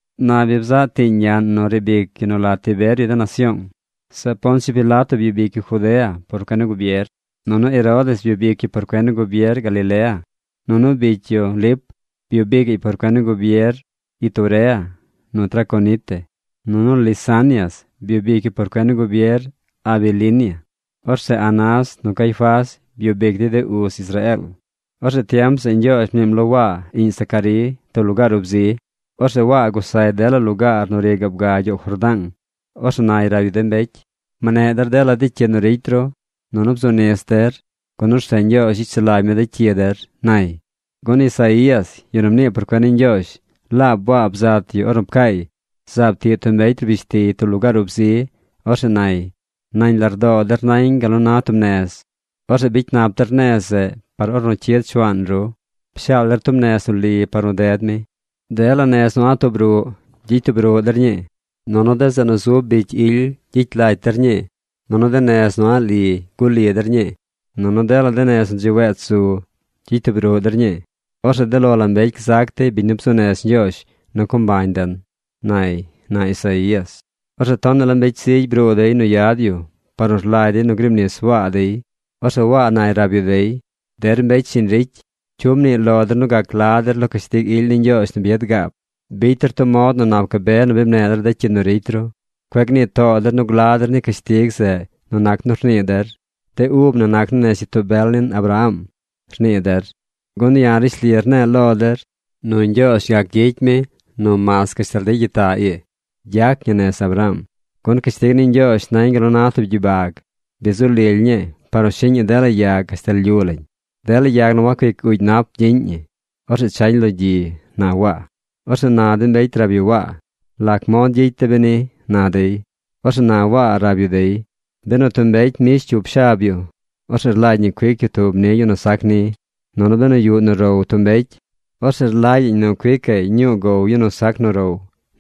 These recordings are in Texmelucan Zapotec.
Na bi bzaꞌ tiiñ ñaꞌn nu riib ic yu nu la Tiberio de nasyoong. Zeꞌ Poncio Pilato byub ic yu Judea por cuen ni gubier. Nunu Herodes byub ic yu por cuen ni gubier Galilea. Nunu bicy yu, Lip, byub icaꞌy por cuen ni gubier Iturea nu Traconite. Nunu Lisanias byub ic yu por cuen ni gubier Abilinia. Orzeꞌ Anás nu Caifás byub ic dey de uz Israeel. Orzeꞌ tiem zeꞌ Ñgyoozh mniim lo Waa, iꞌñ Zacarí, tub lugaar ub zi. Orzeꞌ Waa gusay dela lugaar nu ri gaab ga gyoow Jordaang. Orzeꞌ nay rab yu de mbecy: ― Mneꞌ der dela cyi nu ricy ru nunu bzu nis der, gun orzeꞌ Ñgyoozh gyicy sulagy mi de cyi der ―nay. Gun Isaías, yu nu mnii por cuen ni Ñgyoozh, laab Waa bzat yu ornu pcaay: Zaab tiꞌ tub mbecy rbish tiy tub lugaar ub zi. Orzeꞌ nay: “Nañ lardoo der nañ gal nu na tub nez. Orzeꞌ bicy nap der nez zeꞌ par ornu cyid Shuaan ru. Pshaal der tub nez nu li par nu ded mi. Dela nez nu a̱ꞌ tub ruꞌ gyicy tub ruꞌ der ñii. Nunu de zeꞌ nu zub bicy ily gyicy lacy der ñii. Nunu de nez nu a̱ꞌ li guꞌ li der ñii. Nunu dela de nez nu dzi wech zu, gyicy tub ruꞌ der ñii. Orzeꞌ de lo la mbecy gzac dey biñ nu bzuu nez Ñgyoozh nu co mbañ den”, nay, na Isaías. Orzeꞌ tonaꞌ la mbecy zigy bruu dey nu yad yu par nu rlagy dey nu griib nis Waa dey. Orzeꞌ Waa nay rab yu dey: ―¡Der mbecy shiñ ricy! ¿Cyu mnii lo der nu gac gla der lo cashtig ily ni Ñgyoozh nu bi yad gaab? Bicy der tub mod nu nap gabe nu bi mneꞌ der de cyi nu ricy ru. Cueꞌ gnii too der nu gla der ni de cashtig zeꞌ nu nac nu rnii der: “De ub na nac naa nez gyitoo bel nin Abraham”, rnii der, gun ya̱ rishli rne̱e̱ lo der nu Ñgyoozh gac gyicy mi nu mas gashtal de gyitaꞌ ii gyac ñi nez Abraham. Gun cashtig ni Ñgyoozh nañ gal na tub gyibag. Bi zu lily ñii par nu shiꞌñ ñi dela yag gashtal lyu lañ. Dela yag nu wacuic uugy nap gyiꞌñ ñi. Orzeꞌ chañ lo gyi ―na Waa. Orzeꞌ na de mbecy rab yu Waa: ―¿Lac mod gyicy de̱ beni? ―na dey. Orzeꞌ na Waa rab yu dey: ―Benu tub mbecy mbish cyup shab yu, orzeꞌ rlagy ñi cuic yu tub ni yu nu sac ni, nunu benu yuꞌ nu row tub mbecy, orzeꞌ rlagyaꞌñ nu cuicaꞌy ñuu gow yu nu sac nu row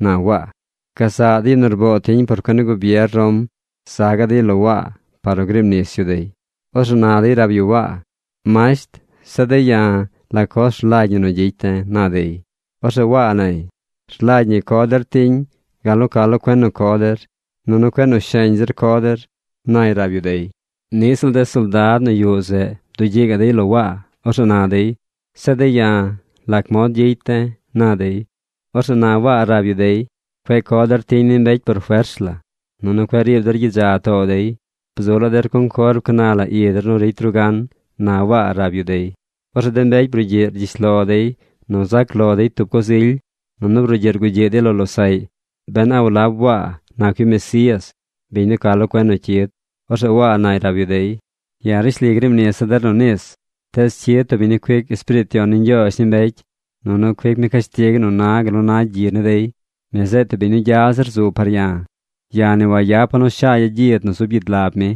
―na Waa. Gazaꞌ de yu nu rboo tiñ por cuen ni gubier Rom za gaꞌ dey lo Waa par nu griib nis yu dey. Orzeꞌ na dey rab yu Waa: ―Masht, zeꞌ de̱ ya̱, ¿la coz rlagy ñi nu gyicy de̱? ―na dey. Orzeꞌ Waa nay: ―Rlagy ñi nu co der tiñ gal nu ca lo cuen nu co der, nunu cueꞌ nu sheñ zir co der ―nay rab yu dey. Niꞌ ziꞌl de soldad nu yuꞌ zeꞌ bdugyiꞌ gaꞌ dey lo Waa. Orzeꞌ na dey: ―Zeꞌ de̱ ya̱, ¿lac mod gyicy de̱? ―na dey. Orzeꞌ na Waa rab yu dey: ―Cueꞌ co der tiñ ni mbecy por fers la, nunu cueꞌ riib der gyidza too dey. Bzu la der conform ca na la i der nu ricy ru gan ―na Waa rab yu dey. Orzeꞌ de mbecy brugyiꞌ rgyish lo dey nu zac lo dey tub coz ily, nunu brugyiꞌ rgugyiꞌ dey lo losaꞌy ben a walab Waa nac yu Mesías, biñ nu ca lo cuen nu cyid. Orzeꞌ Waa nay rab yu dey: ―Ya̱ rishli griib nisa̱ der nu nis, tees cyid tub biñ nu cuic Espiriit Yon ni Ñgyoozh ni mbecy, nunu cuic mi cashtig nu na gal nu na gyi ni dey. Mi zeꞌ tub biñ nu gya zir zu par ya̱. Ya̱ ni wayapa̱ nu shagya̱ gyid nu zub gyid lab mi.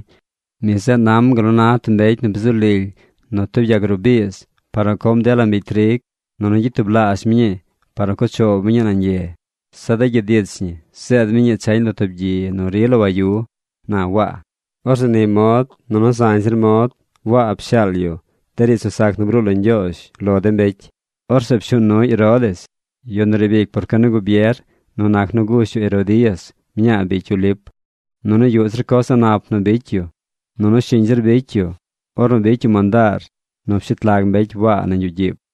Mi zeꞌ nam gal na tub mbecy nu bi zu lily nu tub yag ruꞌ biiz par nu com dela mbigy trig, nunu gyicy tublaazh mi ñii par nu cuꞌ choow mi nañ ye. Zeꞌ de gyid ich ñi zeed mi ñii chañ lo tub gyi nu rila wayu ―na Waa. Orzeꞌ ni mod nunu zañ zir mod Waa pshaal yu de riidz nu sac nu bruu lo Ñgyoozh lo de mbecy. Orzeꞌ pshuu nuy Herodes, yu nu riib ic por cuen ni gubier nu nac nu gush yu Herodías, mñaa bicy yu Lip. Nunu yuꞌ zir coz a̱ꞌ nap nu bicy yu. Nunu shiñ zir bicy yu ornu bicy yu mandaar nu pshet lag mbecy Waa nañ yuꞌ gyiib.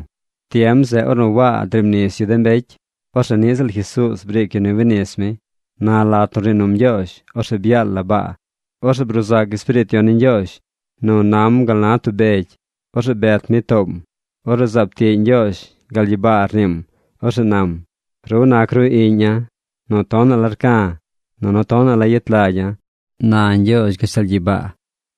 Tiem zeꞌ ornu Waa griib nis yu de mbecy, orzeꞌ niꞌ ziꞌl Jesuuz briic yu nu winis mi. Na lat nu rnii num Ñgyoozh, orzeꞌ byaal la baa. Orzeꞌ bruu zac Espiriit Yon ni Ñgyoozh nu na gal na tub beg. Orzeꞌ bet mi toom. Orzeꞌ zaab tiꞌ Ñgyoozh. Gal gyibaa rniim. Orzeꞌ nam: ―Ru nac ru iꞌña̱ nu tonaꞌ la rca̱, nunu tonaꞌ la yet lagya̱ ―na Ñgyoozh gashtal gyibaa.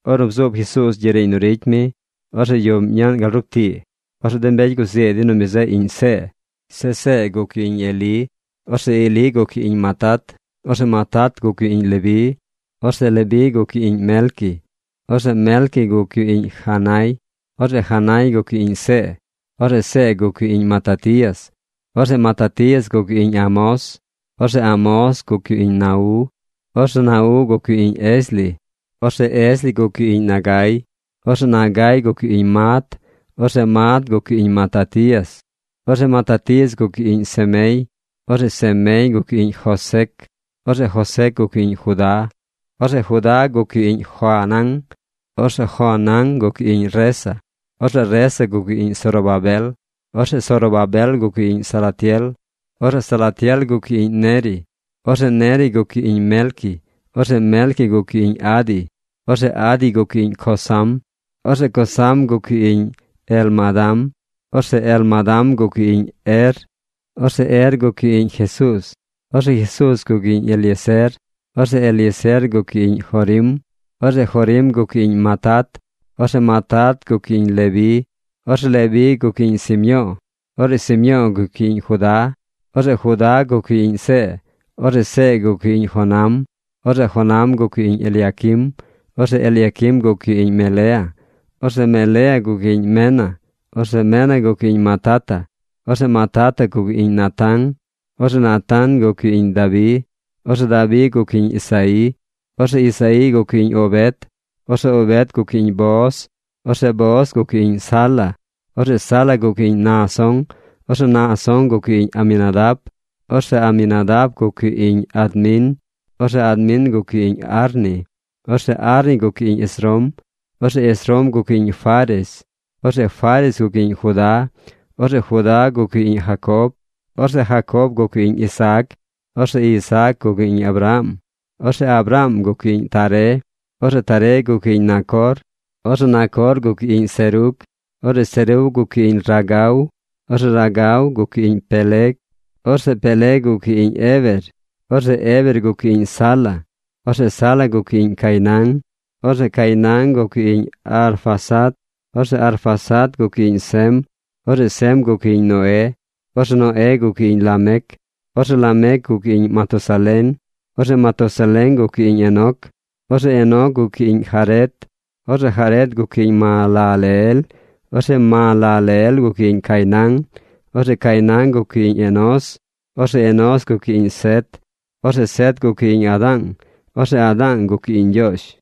Ornu bzuub Jesuuz gyiꞌ riiñ nu ricy mi, orzeꞌ yuꞌm ñaꞌn gal rup tii. Orzeꞌ de mbecy guzii dey nu mi zeꞌ iꞌñ See. Zeꞌ See yu zeꞌ iꞌñ Elí. Orzeꞌ Elí guc yu iꞌñ Matat. Orzeꞌ Matat guc yu iꞌñ Leví. Orzeꞌ Leví guc yu iꞌñ Melqui. Orzeꞌ Melqui guc yu iꞌñ Janai. Orzeꞌ Janai guc yu iꞌñ See. Orzeꞌ See guc yu iꞌñ Matatías. Orzeꞌ Matatías guc yu iꞌñ Amós. Orzeꞌ Amós guc yu iꞌñ Nau. Orzeꞌ Nau guc yu iꞌñ Esli. Orzeꞌ Esli guc yu iꞌñ Nagai. Orzeꞌ Nagai guc yu iꞌñ Maat. Orzeꞌ Maat guc yu iꞌñ Matatías. Orzeꞌ Matatías guc yu iꞌñ Semei. Orzeꞌ Semei guc yu iꞌñ Josec. Orzeꞌ Josec guc yu iꞌñ Judá. Orzeꞌ Judá guc yu iꞌñ Joanán. Orzeꞌ Joanán guc yu iꞌñ Resa. Orzeꞌ Resa guc yu iꞌñ Zorobabel. Orzeꞌ Zorobabel guc yu iꞌñ Salatiel. Orzeꞌ Salatiel guc yu iꞌñ Neri. Orzeꞌ Neri guc yu iꞌñ Melqui. Orzeꞌ Melqui guc yu iꞌñ Adi. Orzeꞌ Adi guc yu iꞌñ Cosam. Orzeꞌ Cosam guc yu iꞌñ Elmadam. Orzeꞌ Elmadam guc yu iꞌñ Er. Orzeꞌ Er guc yu iꞌñ Jesuuz. Orzeꞌ Jesuuz guc yu iꞌñ Eliezer. Orzeꞌ Eliezer guc yu iꞌñ Jorim. Orzeꞌ Jorim guc yu iꞌñ Matat. Orzeꞌ Matat guc yu iꞌñ Leví. Orzeꞌ Leví guc yu iꞌñ Simyo̱o̱. Orzeꞌ Simyo̱o̱ guc yu iꞌñ Judá. Orzeꞌ Judá guc yu iꞌñ See. Orzeꞌ See guc yu iꞌñ Jonam. Orzeꞌ Jonam guc yu iꞌñ Eliaquim. Orzeꞌ Eliaquim guc yu iꞌñ Melea. Orzeꞌ Melea guc yu iꞌñ Mena. Orzeꞌ Mena guc yu iꞌñ Matata. Orzeꞌ Matata guc yu iꞌñ Natán. Orzeꞌ Natán guc yu iꞌñ Dabi. Orzeꞌ Dabi guc yu iꞌñ Isaí. Orzeꞌ Isaí guc yu iꞌñ Obed. Orzeꞌ Obed guc yu iꞌñ Booz. Orzeꞌ Booz guc yu iꞌñ Sala. Orzeꞌ Sala guc yu iꞌñ Naasón. Orzeꞌ Naasón guc yu iꞌñ Aminadab. Orzeꞌ Aminadab guc yu iꞌñ Admin. Orzeꞌ Admin guc yu iꞌñ Arni. Orzeꞌ Arni guc yu iꞌñ Esrom. Orzeꞌ Esrom guc yu iꞌñ Fares. Orzeꞌ Fares guc yu iꞌñ Judá. Orzeꞌ Judá guc yu iꞌñ Jacob. Orzeꞌ Jacob guc yu iꞌñ Isaac. Orzeꞌ Isaac guc yu iꞌñ Abraham. Orzeꞌ Abraham guc yu iꞌñ Taré. Orzeꞌ Taré guc yu iꞌñ Nacor. Orzeꞌ Nacor guc yu iꞌñ Serug. Orzeꞌ Serug guc yu iꞌñ Ragau. Orzeꞌ Ragau guc yu iꞌñ Peleg. Orzeꞌ Peleg guc yu iꞌñ Heber. Orzeꞌ Heber guc yu iꞌñ Sala. Orzeꞌ Sala guc yu iꞌñ Cainán. Orzeꞌ Cainán guc yu iꞌñ Arfaxad. Orzeꞌ Arfaxad guc yu iꞌñ Sem. Orzeꞌ Sem guc yu iꞌñ Noé. Orzeꞌ Noé guc yu iꞌñ Lamec. Orzeꞌ Lamec guc yu iꞌñ Matusalén. Orzeꞌ Matusalén guc yu iꞌñ Enoc. Orzeꞌ Enoc guc yu iꞌñ Jared. Orzeꞌ Jared guc yu iꞌñ Mahalaleel. Orzeꞌ Mahalaleel guc yu iꞌñ Cainán. Orzeꞌ Cainán guc yu iꞌñ Enós. Orzeꞌ Enós guc yu iꞌñ Set. Orzeꞌ Set guc yu iꞌñ Adaang. Orzeꞌ Adaang guc yu iꞌñ Ñgyoozh.